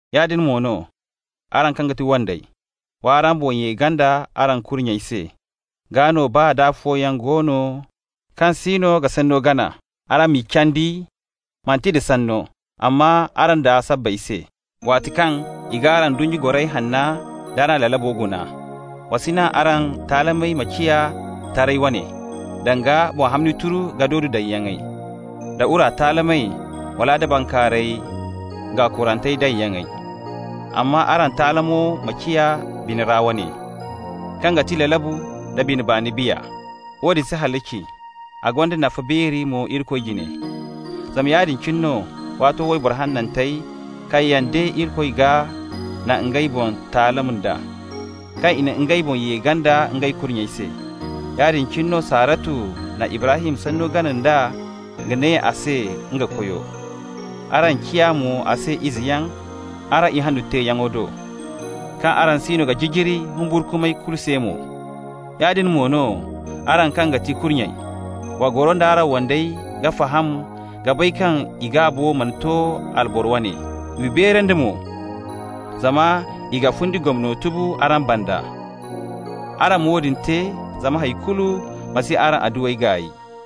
Yaadin mo no, araŋ kaŋ ga ti wandey: w'araŋ boŋ ye ganda araŋ kurnyey se, gaa no baa da afooyaŋ go no kaŋ siino ga sanno gana, araŋ m'i candi, manti nda sanno, amma araŋ daa sabbay se, waati kaŋ i g'araŋ ndunnya goray hanna d'araŋ lalabo guna. Wa si naŋ araŋ taalamey ma ciya taray wane, danga boŋ hamni turu ka dodo daŋyaŋey, da wura taalamey, wala da bankaaray gaakurante daŋyaŋey. Amma araŋ taalamo ma ciya bina ra wane, kaŋ ga ti lalabu nda bine baani biya. Woodin si halaci, a gonda nafa beeri mo Irikoy jine. Zama yaadin cine no waato wayboro hanantey kaŋ yaŋ de Irikoy gaa na ngey boŋ taalam d'a, kaŋ i na ngey boŋ ye ganda ngey kurnyey se. Yaadin cine no Saharatu na Ibrahim sanno gana nd'a ka ne a se nga koyo. Araŋ ciya mo a se izeyaŋ araŋ ihanno teeyaŋo do, kaŋ araŋ siino ga jijiri humburkumay kulu se mo. Yaadin mo no, araŋ kaŋ ga ti kurnyey: wa goro nd'araŋ wandey ka faham ka bay kaŋ i gaabo mana to alboro wane. W'i beerandi mo zama i ga fundi gomno tubu araŋ banda. Araŋ ma woodin te zama hay kulu ma si araŋ adduwey gaay.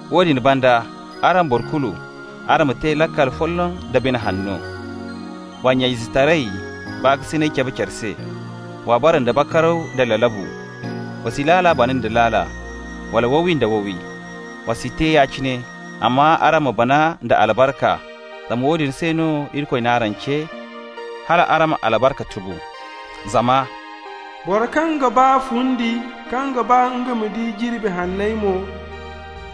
Woodin banda, araŋ boro kulu, araŋ ma te laakal folloŋ da bine hanno. Wa nya-izetaray baakasinay cabe care se. Wa bara nda bakaraw da lalabu. Wa si laala bana nda laala, wala wowi nda wowi. Wa si te ya-cine, amma araŋ ma bana nda albarka, zama woodin se no Irikoy n'araŋ ce, hal araŋ ma albarka tubu. Zama «Boro kaŋ ga ba fundi, kaŋ ga ba nga ma di jirbi hanney mo,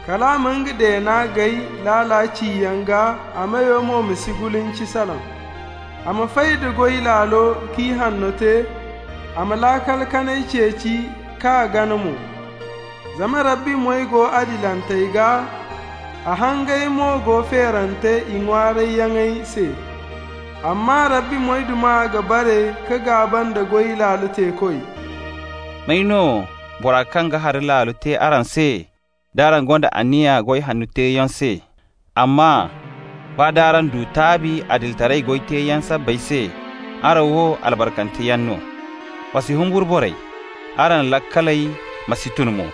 Kal a ma nga deena gaay laala ciyaŋ gaa, a meyo mo ma si gulinci salaŋ. A ma fay da goy laalo ka ihanno te, A ma laakal kanay ceeci k'a gana mo. Zama Rabbi moy go adilantey gaa, A hangey mo go feerante i ŋwaarayyaŋey se. Amma Rabbi moyduma ga bare ka gaaba nda goy laalo teekoy.» May no bora kaŋ ga hari laalo te araŋ se d'araŋ gonda anniya goy hanno teeyaŋ se? Amma baa d'araŋ du taabi adilitaray goy teeyaŋ sabbay se, araŋ wo, albarkanteyaŋ no. Wa si humburu borey, araŋ laakaley ma si tun mo.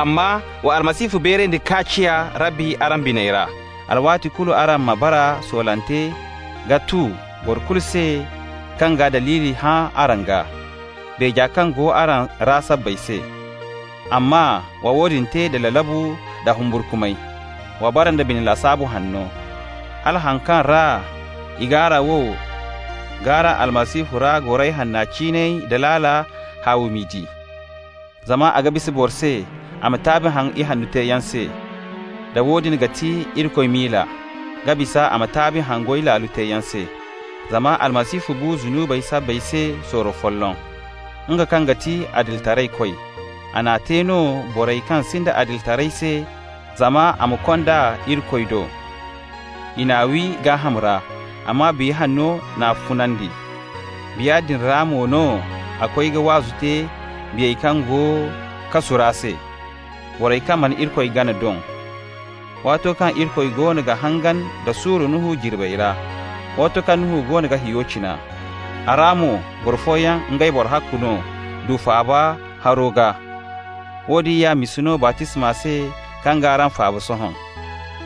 Amma wa Almasihu beerandi k'a ciya Rabbi araŋ biney ra. Alwaati kulu araŋ ma bara soolante ka tu boro kulu se kaŋ ga daliili hã araŋ gaa, beeja kaŋ go araŋ ra sabbay se. Amma wa woodin te da lalabu nda humburkumay. Wa bara nda bine lasaabu hanno, hala haŋ kaŋ ra i g'araŋ wow k'araŋ Almasihu ra goray hanna ciinay da laala, haawi m'i di. Zama a ga bisa boro se a ma taabi haŋ ihanno teeyaŋ se, da woodin ga ti Irikoy miila, ka bisa a ma taabi haŋ goy laalo teeyaŋ se. Zama Almasihu bu zunubey sabbay se sorro folloŋ. Nga kaŋ ga ti adilitaraykoy, a n'a te no borey kaŋ sinda adilitaray se zama a ma konda iri Irikoy do. I n'a wi gaaham ra, amma Biya Hanno n'a funandi. Biya din ra mo no a koy ka waazu te biyey kaŋ go kasu ra se, borey kaŋ mana Irikoy gana doŋ, waato kaŋ Irikoy goono ga hangan da suuru Nuhu jirbey ra, waato kaŋ Nuhu goono ga hiyo cina. A ra mo, boro fooyaŋ, ngey boro ahakku no, du faaba haro gaa. Woodin ya misa no baptisma se kaŋ g'araŋ faaba sohõ.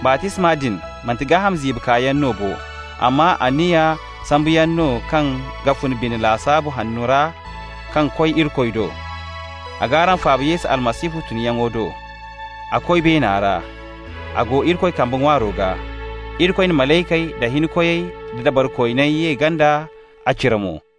Baptisma din, manti gaaham ziibi kaayaŋ no bo, amma anniya sambuyaŋ no kaŋ ga fun bine lasaabu hanno ra ka koy Irikoy do. A g'araŋ faaba Yesu Almasihu tunyaŋo do. A koy beena ra. A go Irikoy kamba ŋwaaro gaa. Irikoy na malaykey da hinkoyey da dabarikooney ye ganda a cire mo.